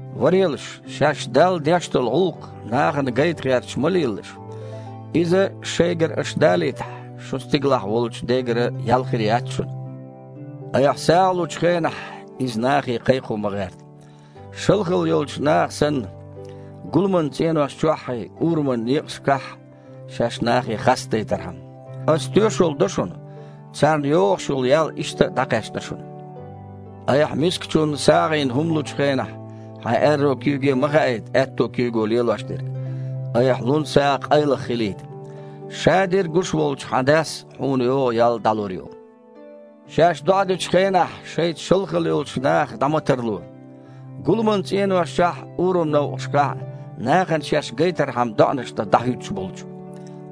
«Варелаш, шаьш Далла деш долу гІуллакх нахана гайта гІерташ ма лелалаш. Иза аша шайгара далийтахь, шун стигалахь волчу Дегара ял хир яц шуна. Айхьа сагІа лучу хенахь, иза нахе кхайкхо ма гІерта, шалхалла йолчу наха санна, гуламан цІенош чоххьий, ураман некъашкахь шаьш нахе хастадайтархьама. Аса тоьшалла до шуна: царна йогІуш йолу ял иштта а дІакхаьчна шуна. Айхьа мискачунна сагІина хІума лучу хенахь хьайн аьрру куьйге а ма хаийта аьтту куьйго лелош дерг, айхьа лун сагІа къайлаха хилийта. Шадерг а гуш волчу хьан Дас хьуна йогІу ял дІалур ю». «Шаьш доІа дечу хенахь шайца шалхалла йолчу нахах дІа ма тарло, гуламан цІенош чохь а, ураман некъашкахь а нахана шаьш гайтархьама доІанаш дан дІахІуьттуш болчу.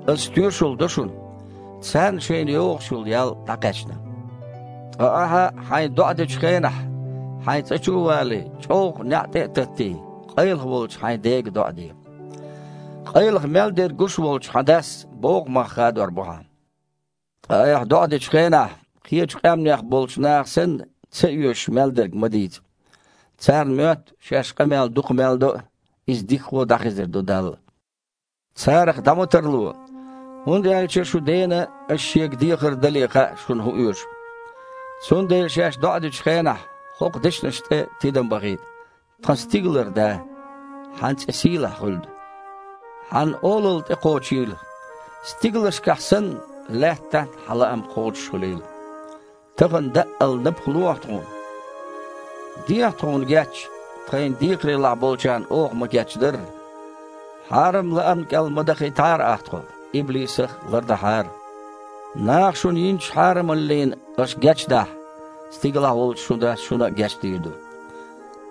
Аса тоьшалла до шуна: царна шайна йогІуш йолу ял дІакхаьчна. Ткъа ахьа хьайн доІа дечу хенахь, хьайн цІа чу а валий, чІоггІа неІ тІе а таттий, къайлаха волчу хьайн Дега доІа де. Къайлаха мел дерг гуш волчу хьан Дас боггІу мах хадор бу хьан. Ткъа айхьа доІа дечу хенахь, кхечу къаьмнех болчу наха санна, ца оьшуш мел дерг ма дийца. Царна моьтту, шаьш къамел дукха мел до а, иза дикахо дІахезар ду Далла. Царах дІа ма тарло, хІунда аьлча шун Дена аш Шега дехар а дале хаьа, шуна хІун оьшу. Цундела шаьш доІа дечу хенахь хІокху дешнашна тІе тидам бахийта: Тхан стигалара Да! Хьан цІе сийлахь хуьлда! Хьан Олалла тІекхочийла. Стигалшкахь санна, лаьттахь а Хьан лаам кхочушхуьлийла. Тахана даъал напха лохьа тхуна! Дехьа тхуна геч, тхайна декхарийлахь болчарна оха ма-гечдарра. Хьарам лаамна кІел а ма дахийтахьара Ахьа тхо, иблисах а лардахьара. Наха шуна йинчу хьарамаллина аша гечдахь, стигалахь волчу шун Дас шуна а дийр ду геч.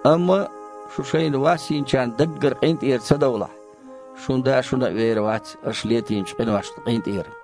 Амма шу шайна вас йинчарна даггара къинтІера ца довлахь, шун Да шуна а вер вац аша летийначу къиношна къинтІера».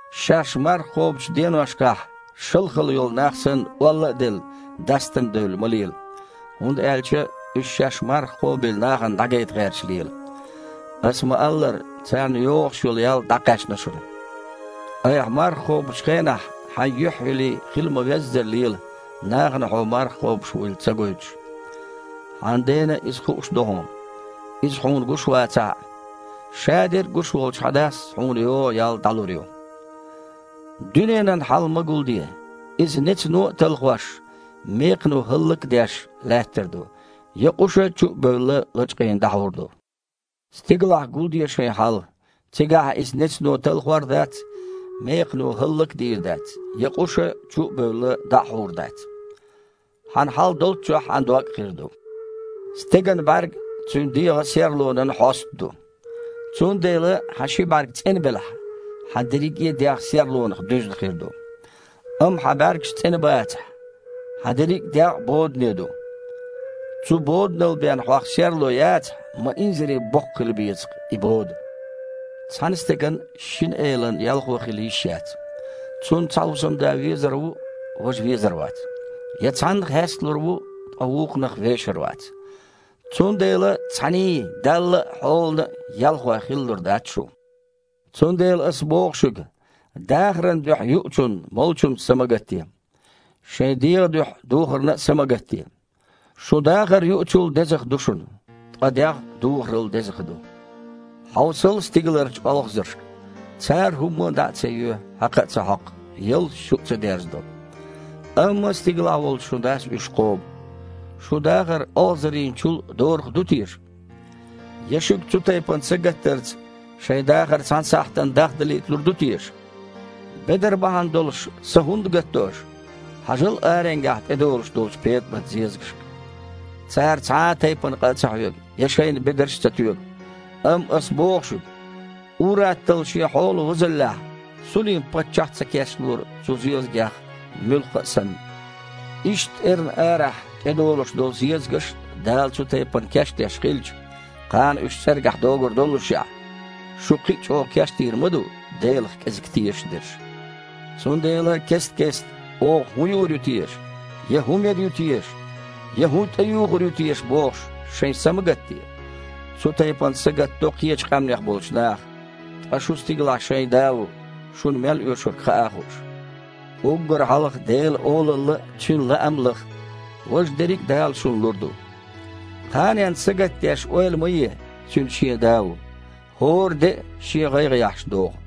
«Шаьш марха кхобучу деношкахь, шалхалла йолу нах санна, олла а делла, дастам девлла ма лела, хІунда аьлча уьш шаьш марха кхобийла нахана дІагайта гІерташ лела. Аса ма-аллара, царна йогІуш йолу ял дІакхаьчна шуна. Айхьа марха кхобучу хенахь хьайн юьхь а йилий, хила ма-веззара лела, нахана хьуо марха кхобуш вуйла а ца гойтуш. Хьан Дена иза хууш ду хьуна, Иза хьуна гуш вацахь а. Шадерг а гуш волчу хьан Дас хьуна йогІу ял дІалур ю». «Дуьненан хьал ма гулде. Иза, нецано а талхош, мекхано хІаллак а деш, лаьттар ду, я къуша, чу а бевлла, лачкъийна дІахьур ду. Стигалахь гулде шайна хьал. Цигахь иза нецано талхор а дац, мекхано хІаллак а дийр дац, я къуша, чу а бевлла, дІа а хьур дац. Хьан хьал долчохь хьан дог а хир ду. Стеган бІаьрг цуьнан дегІан серлонан хьоста ду. Цундела хьан ши бІаьрг цІена белахь, хьан дерриге а дегІ серлонах дуьзна хир ду. Амма хьан бІаьргаш цІена бацахь, хьан дерриг дегІ а бодане ду! Цу боданал бен хьох серло яцахь, ма инзаре боккха хила беза-кх и бода! Цхьана стеган шина элан ялхо хила йиш яц. Цунна цхьа хІусамда везар ву, важа везар вац, я цхьанна хьесталур ву, ткъа вукхунах вешар вац. Цундела цхьаьний – Далла а, хьолана а ялхой хилалур дац шу». «Цундела Аса боху шуьга: дахаран дуьхьа юучунна, молучунна са ма гатде. Шайн дегІан дуьхьа духарна а са ма гатде. Шун дахар юучул дезах ду шуна, ткъа дегІ духарал дезах ду. Хьовсал стигаларчу олхазаршка! Цара хІумма дІа а ца йоь, хьакха а ца хьокху, ялташ чу а ца дерзадо. Амма стигалахь волчу шун Дас уьш кхобу. Шун дахар олхазарийнчул а дораха ду теша? Я шуьга цу тайпана сагатдарца шайн дахар цхьана сахьтана дахдалийталур ду теша? Бедар бахьана долуш са хІунда гатдо аша? Хьажал аренгахь тІедолуш долчу петІамат-зезагашка. Цара цхьа а тайпана къа а ца хьоьгу я шайна бедарш а ца тоьгу. Амма Ас боху шуьга, ур-атталла шен хьолан возаллехь Сулим-паччахь а ца кечлора цу зезагех муьлхха а санна. Иштта эрна арахь тІедолуш долу зезагаш а Дала цу тайпана кечдеш хилча, кхана уьш цІергахь догур доллушехь, шу кхин а чІогІа кечдийр ма ду, Делах кІезиг тешаш дерш. Цундела кест-кестта: „Оха хІун юур ю теша?“, я: „ХІун мер ю теша?“, я: „ХІун тІеюхур ю теша?“ – бохуш, шайн са ма гатде. Цу тайпана сагатдо кхечу къаьмнех болчу наха. Ткъа шун стигалахь шайн Да ву, шуна мел оьшург хаа а хууш. Уггар хьалха Делан Олалла а, Цуьнан лаам а лаха. Важа дерриг а Дала шуна лур ду. Кханенна сагатдеш ойла ма е – цуьнан шен Да ву. ХІора де а шен гІайгІа яхьаш догІу».